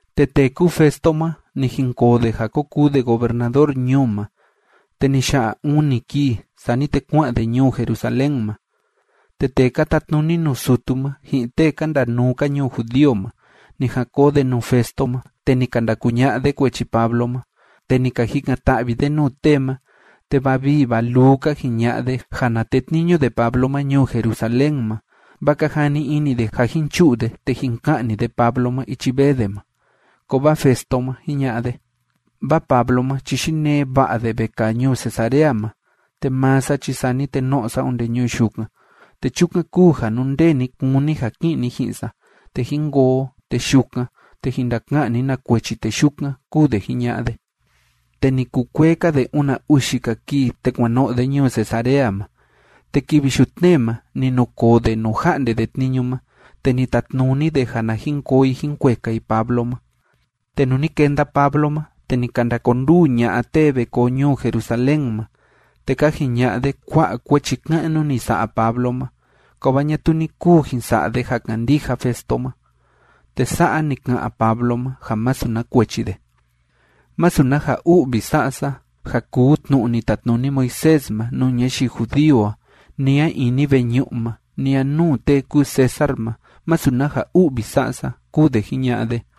Te tee kúu Festo ma, ni jinkoo de ja ko kuu de gobernador ñuu ma, te ni ya'a uni kii, sani te kua'an de ñuu Jerusalén ma. Te tee ka tatnuni nuu sutu ma, ji'in tee ka ndanuu‑ka ñuu judío ma, ni jan koo de nuu Festo ma, te ni ka ndakuña'a de kuechi Pablo ma, te ni ka jikan‑ta'vi de nuu tee ma, te va vii va luu ka jiña'a de ja na tetniñu de Pablo ma ñuu Jerusalén ma, vaa ka jani ini de ja jin chu'u de te jin ka'ni de Pablo ma ichi vee de ma. Kovaa Festo ma, jiña'a de: ―Vaa Pablo ma chi yinee va'a de vekaa ñuu Cesarea ma, te maa sa chi sani te no'o sa onde ñuu yukan, te chukan kúu ja nú ndee ni kúni ja ki'in ni ji'in sa, te jín koo o, te yukan, te jin ndaka'an ni na kuechi tee yukan ―kúu de jiña'a de. Te ni kukuee‑ka de una uxi‑ka kii, te kuan no'o de ñuu Cesarea ma. Te kivi yutnee ma ni nukoo de nuu ja'nde de tniñu ma, te ni tatnuni de ja na jin koo i jín kueka i Pablo ma. Te nuu ni kenda Pablo ma, te ni ka ndakonduu ña'a tee ve koo ñuu Jerusalén ma, te ka jiña'a de kua'a kuechi ka'nu ni sa'a Pablo ma, kovaa ñatuu ni kuu jin sa'a de ja kandija Festo ma. Te sa'a ni ka'an Pablo ma ja masu na kuechi de: ―Masu na ja u'vi sa'a sa, ja kuu tnu'u ni tatnuni Moisés ma nuu ñayii judío a, ni a ini veñu'u ma, ni a nuu tee kúu César ma masu na ja u'vi sa'a sa ―kúu de jiña'a de.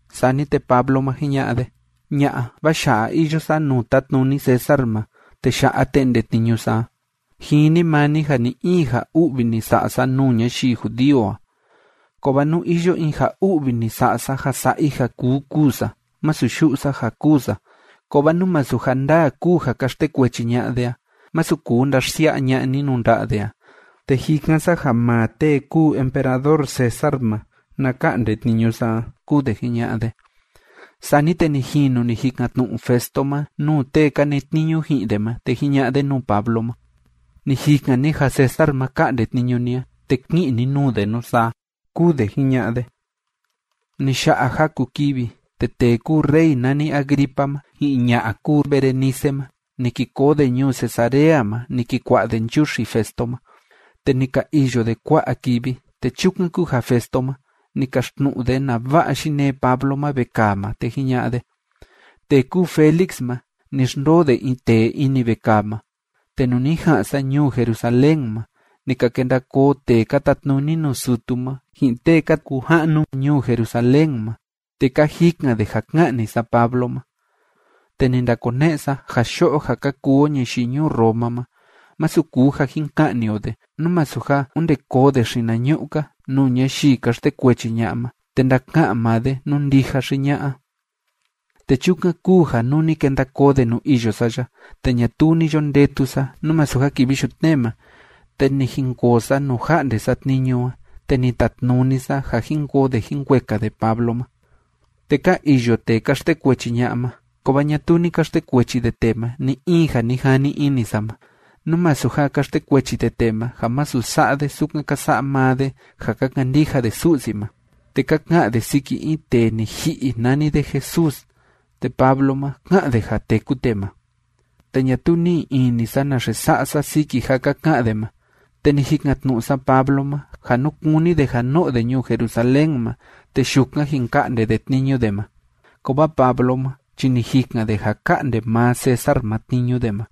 Sani te Pablo ma, jiña'a de: ―Ña'a, vaa ya'a iyo sa nuu tátnuni César ma, te ya'a te'nde tniñu sa a. Jini maa ni ja ni‑in ja u'vi ni sa'a sa nuu ñayii judío a. Kovaa nú iyo in ja u'vi ni sa'a sa ja sa'a i ja kuu kûu sa, masu yu'u sa ja kûu sa. Kovaa nú masu ja ndaa kúu ja ka xtekuechi ña'a de a, masu kuu ndaxsia'a ña'a ni nuu nda'a de a, te jikan sa ja maa tee kúu emperador César ma na ka'nde tniñu sa a ―kúu de jiña'a de. Sani te ni jinu ni jikan‑tnu'u Festo ma nuu tee ka netniñu ji'in de ma, te jiña'a de nuu Pablo ma: ―Ni jikan ni ja César ma ka'nde tniñu ni a, te ki'in ni nuu de nusaa ―kúu de jiña'a de. Ni ya'a jaku kivi, te tee kúu rey nani Agripa ma, ji'in ña'a kúu Berenice ma, ni ki koo de ñuu Cesarea ma ni ki kua'a de nchuxi Festo ma. Te ni ka iyo de kua'a kivi, te chukan kúu ja Festo ma, ni kaxtnu'u de nava'a yinee Pablo ma vekaa ma, te jiña'a de: ―Tee kúu Félix ma, ni xndoo de in tee ini vekaa ma. Te nuu ni ja'an sa ñuu Jerusalén ma, ni ka kenda koo tee ka tatnuni nuu sutu ma, ji'in tee ka kuu ja'nu ñuu Jerusalén ma, te ka jikan de ja ka'ni sa Pablo ma. Te ni ndakone'e sa ja yo'o ja ka kuu o ñayii ñuu Roma ma, masu kuu ja jin ka'ni o de, nú masu ja onde koo de xinañu'u‑ka nuu ñayii ka xtekuechi ña'a ma, te ndaka'an maa de nú ndija xi ña'a. Te chukan kúu ja nuu ni kenda koo de nuu iyo sa ya, te ñatuu ni yo ndetu sa, nú masu ja kivi yutnee ma, te ni jinkoo sa nuu ja'nde sa tniñu a, te ni tatnuni sa ja jin koo de jin kueka de Pablo ma. Te ka iyo tee ka xtekuechi ña'a ma, kovaa ñatuu ni ka xtekuechi de tee ma ni‑in ja ni jani ini sa ma, nú masu ja ka xtekuechi de tee ma ja masu sa'a de sukan ka sa'a maa de ja ka kandija de Su'si ma, te ka ka'an de siki in tee ni ji'i nani de Jesús, te Pablo ma, ká'an de ja téku tee ma. Te ñatuu ni'i ini sa naxe sa'a sa siki ja ka ka'an de ma, te ni jikan‑tnu'u sa Pablo ma ja nú kúni de ja no'o de ñuu Jerusalén ma, te yukan jin ka'nde de tniñu de ma. Kovaa Pablo ma chi ni jikan de ja ka'nde maa César ma tniñu de ma.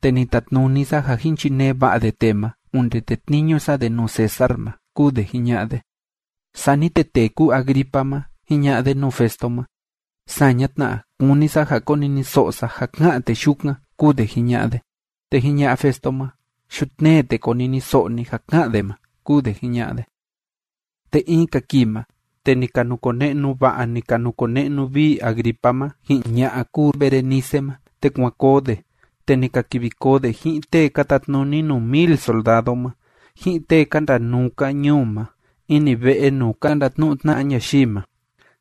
Te ni tatnuni sa ja jín chinee va'a de tee ma onde tetniñu sa de nuu César ma ―kúu de jiña'a de. Sani te tee kúu Agripa ma, jiña'a de nuu Festo ma: ―Saña tna, kúni sa ja koniniso'o sa ja ká'an tee yukan ―kúu de jiña'a de. Te jiña'a Festo ma: ―Yutnee, te koniniso'o ni ja ká'an de ma ―kúu de jiña'a de. Te in‑ka kii ma, te ni ka nukone'nu va'a, ni ka nukone'nu vii Agripa ma ji'in ña'a kúu Berenice ma, te kuan koo de, te ni ka kivi koo de ji'in tee ka tatnuni nuu mil soldado ma, ji'in tee ka ndanuu‑ka ñuu ma ini ve'e nuu ka ndatnu'u tna'a ñayii ma.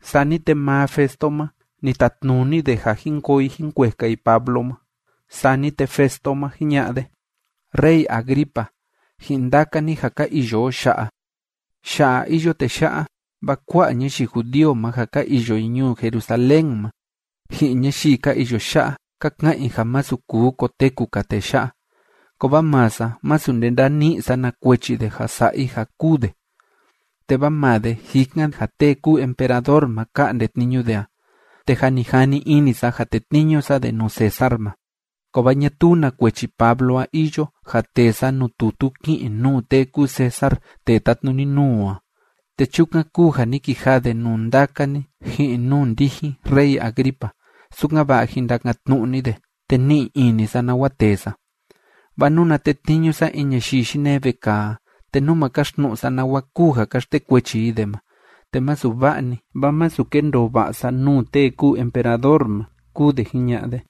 Sani te maa Festo ma, ni tatnuni de ja jín koo i jín kueka i Pablo ma. Sani te Festo ma, jiña'a de: ―Rey Agripa ji'in ndaka ni ja ka iyo o ya'a, ya'a iyo tee ya'a, vaa kua'a ñayii judío ma ja ka iyo i ñuu Jerusalén ma, ji'in ñayii ka iyo ya'a, ka ka'an i ja masu kuu koteku‑ka tee ya'a. Kovaa maa sa, masu nde ndani'i sa na kuechi de ja sa'a i ja kûu de. Te vaa maa de jikan ja tee kúu emperador ma ka'nde tniñu de a, te jâ ni jani ini sa ja tetniñu sa de nuu César ma. Kovaa ñatuu na kuechi Pablo a iyo ja tee sa nuu tutu ki'in nuu tee kúu César tee tátnuni nuu o a, te chukan kúu ja ni kijaa de nuu ndaka ni ji'in nuu ndijin rey Agripa, sukan‑va'a jin ndakan‑tnu'u ni de, te ni'i ini sa nawa tee sa. Vaa nuna tetniñu sa in ñayii yinee vekaa a, te nú ma kaxtnu'u sa nawa kúu ja ka xtekuechi i de ma, te masu va'a‑ni, vaa masu kendoo va'a sa nuu tee kúu emperador ma ―kúu de jiña'a de.